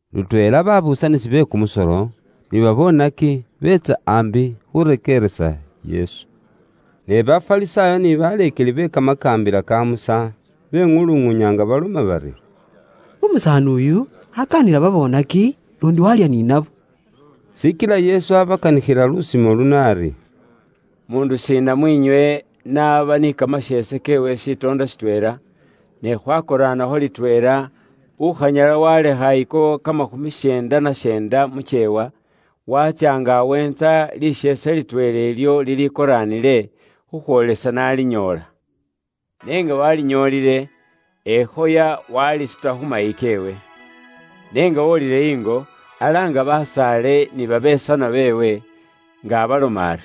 Lutweela babuusanisi be kumusolo ni babonaki biitsa ambi khurekeeresa Yesu. Ne Bafarisaayo ni baleekeli be Kamakaambila ka Musa, beŋuluŋuunya nga baloma bari, “Umusaani uyu, akaanila babonaki, luundi walya ni nabo.” Shikila Yesu abakanikhila lusimo luno ari: “Muundu shiina mus'iinywe, n'aba ni kamasheese keewe shitoondo shitweela, ne khwakoraanakho litweela, ukhanyala waalekha ako kamakhumi syeenda na syeenda mu kyeewa, waatsya nga aweentsa lisheese litweela ilyo lilikoraanile, khukhwoolesa n'alinyoola? N'enga waalinyoolile, ekhoya waalisuta khumayi keewe. N'enga wolile ingo, alaanga basaale ni babesanwa beewe, nga abaloma ari,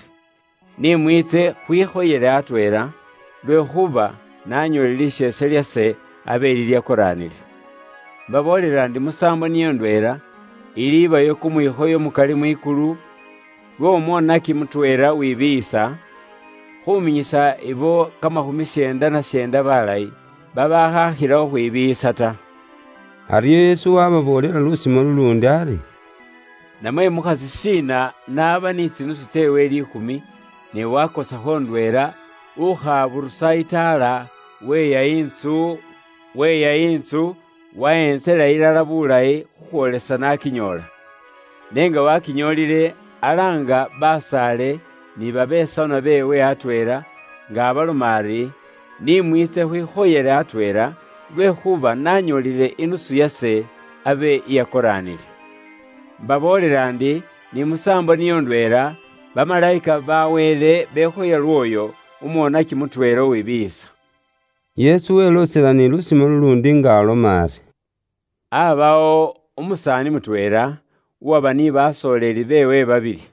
‘Ni mwiitse khwikhoyele atweela, lwekhuuba nanyoolile lisheese lyase abe lilyakoraanile.’ “Mbaboolela ndi musaambo niyo ndweela, ilibayo kumwikhoyo mukali mwikulu, lw'omwonaki mutweela uwibiiyisa, khuminyisa ibo kamakhumi syeenda na syeenda balayi, babaakhakhila khukhwibiiyisa ta.” Aryo Yesu waababoolela lusimo luluundi ari: “Namwe mukhasi shiina n'aba ni tsinusu tseewe liikhumi, ne waakosakho ndweela, ukhaburusa itaala, weeya intsu, waheentsela ilala bulayi, khukhwoolesa n'akinyoola? N'enga wakinyoolile, alaanga basaale ni babesanwa beewe atweela, nga abaloma ari, ‘Ni mwiitse khwikhoyele atweela, lwekhuuba nanyoolile inusu yase abe iyakoraanile.’ Mbaboolela ndi, ni musaambo niyo ndweela, bamalayika ba Wele bekhoya lwooyo, umwonaki mutweela uwibiiyisa.” Yesu weloosela ni lusimo luluundi nga aloma ari: “Aabawo umusaani mutweela, uwaba ni basooleli beewe babili.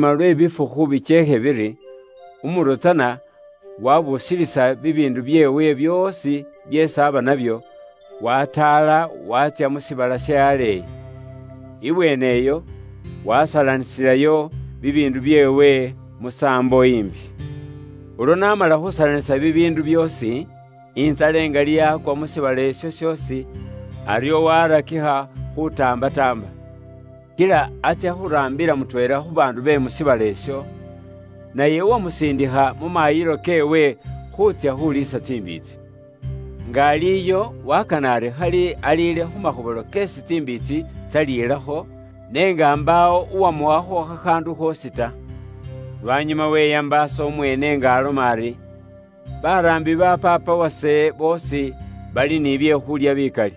“Lwanyuma lwe bifukhu bikyeekhe biri, umuro tsana waabuusilisa bibiindu byeewe byoosi byeesi aaba nabyo, wataala waatsya mu shiibala she aleeyi. Ibweeneyo, wasalanisilayo bibiindu byeewe musaambo imbi. Ulwo n'amala khuusalanisa bibiindu byoosi, intsala ingali yaakwa mu shiibala isho shoosi, aryo waarakikha khuutaambataamba. Kila atsya khuraambila mutweela khu baandu be mu shiibala isho, naye uwamusiindikha mu maayilo keewe khuutsya khuliisa tsimbiitsi. Nga ali iyo, wakana ari khali aliile khu makhobola keesi tsimbiitsi tsalilakho, n'enga mbaawo uwamuwakho khakhaandu khoosi ta. “Lwanyuma weyambaasa umweene nga aloma ari, ‘Baraambi ba paapa wase boosi bali ni bye khuulya bikali.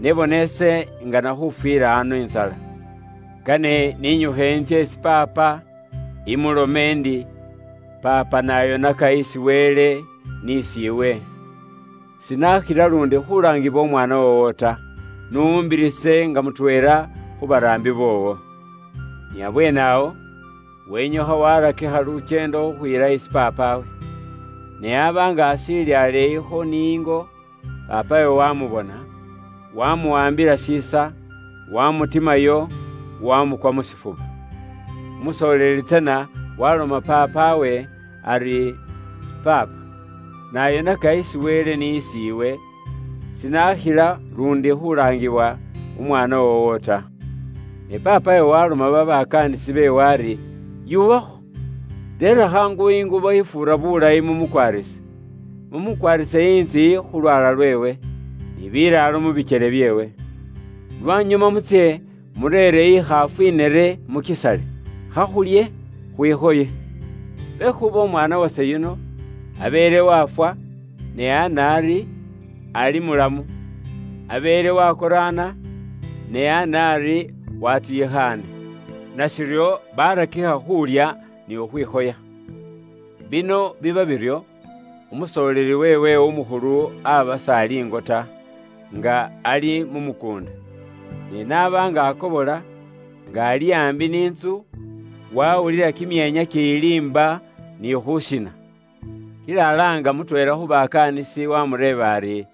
Ne bona ise ingana khufwila ano intsala! Kane ise ninyukhe ano intsye isi paapa imulome ndi, paapa ise nayonaka isi Wele mwikulu, n'isi iwe. Sinakhila luundi khulaangibwa umwaana woowo ta. N'umbirise ise nga mutweela khu baraambi boowo.’ “Ni abweene awo, wenyukha warakikha lukyeendo khukhwiila isi paapawe. Ne aba nga ashiili aleeyikho ni ingo, paapawe wamubona, waamuwaambila shiisa, wamutimayo, wamukwa mu shifuba. Umusooleli tsana waloma paapawe ari, ‘Paapa, ise nayonaka isi Wele mwikulu, n'isi iwe. Sinakhila luundi khulaangiwa umwaana woowo ta.’ “Ne paapawe waloma babakaanisi beewe ari ‘Yuubakho! Reera khaangu ingubo ifuura bulayi mu mukwaarise. Mu mukwaarise intsiyi khu lwaala lweewe, ni bilaalo mu bikyele byeewe. Lwanyuma mutsye mureere ikhaafu inere mukisale. Khakhulye khwikhoye! Lwekhuuba umwaana wase yuno, abeele wafwa, ne ana ari, ali mulamu, abeele wakoraana, ne ana ari watuyikhaane.’ Nashiryo, barakikha khuulya ni khukhwikhoya. “Bino biba biryo, umusoleeli weewe umukhulu aba s'ali ingo ta, nga ali mu mukuunda. Ne n'aba nga akobola, nga ali aambi ni ntsu, wawulila kimyeenya kiyiliimba, ni khushiina. Kila alaanga mutweela khu bakaanisi, waamureeba ari,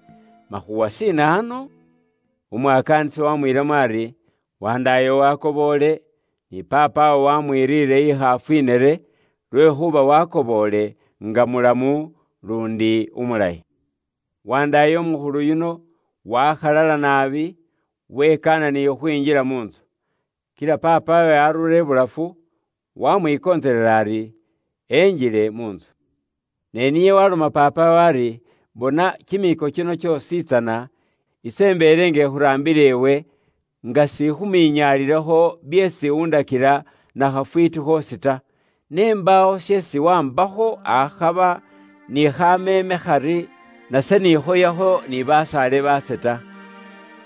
‘Makhuuwa shiina ano?’ Umwakaanisi wamwiilamo ari, ‘Wandaayo wakoboole, ni paapawo wamwiriire ikhaafu inere, lwekhuuba wakoboole nga mulamu, luundi umulayi.’ “Wandaaye umukhulu yuno wakhalala naabi, wekaana ni khukhwinjila mu ntsu. Kila paapawe arura ibulafu, wamwikontselela ari enjile mu ntsu. Ne niye waloma paapawe ari, ‘Bona kimiiko kino kyoosi tsana, ise imbeele nga ikhuraambila iwe nga sikhuminyaalilakho byeesi undakila na khafwiiti khoosi ta. Ne mbaawo sheesi waambakho akhaba ni khameeme khari, nase nikhoyakho ni basaale baase ta.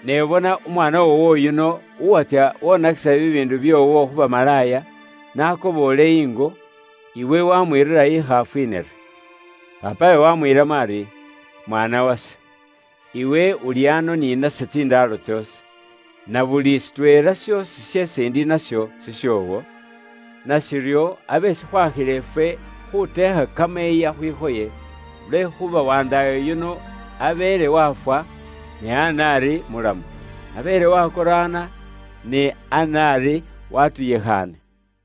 Ne bona umwaana woowo yuno, uwatsya wonakisila bibiindu bye mu bulamu bwoowo byoosi khu bamalaaya, n'akoboole ingo, iwe wamwiirira ikhaafu inere.’ Paapawe wamwiilamo ari, ‘Mwaana wase, iwe uli ano ni nase tsindaalo tsoosi, na buli shitweela shoosi sheesi indi nasho shishoowo. Nashiryo, abe shikhwakhila ifwe khuteekha kamayiiya khwikhoye, lwekhuuba wandaayo yuno abeele wafwa, ne ana ari mulamu, abeele wakoraana, ne ana ari watuyikhaane.’”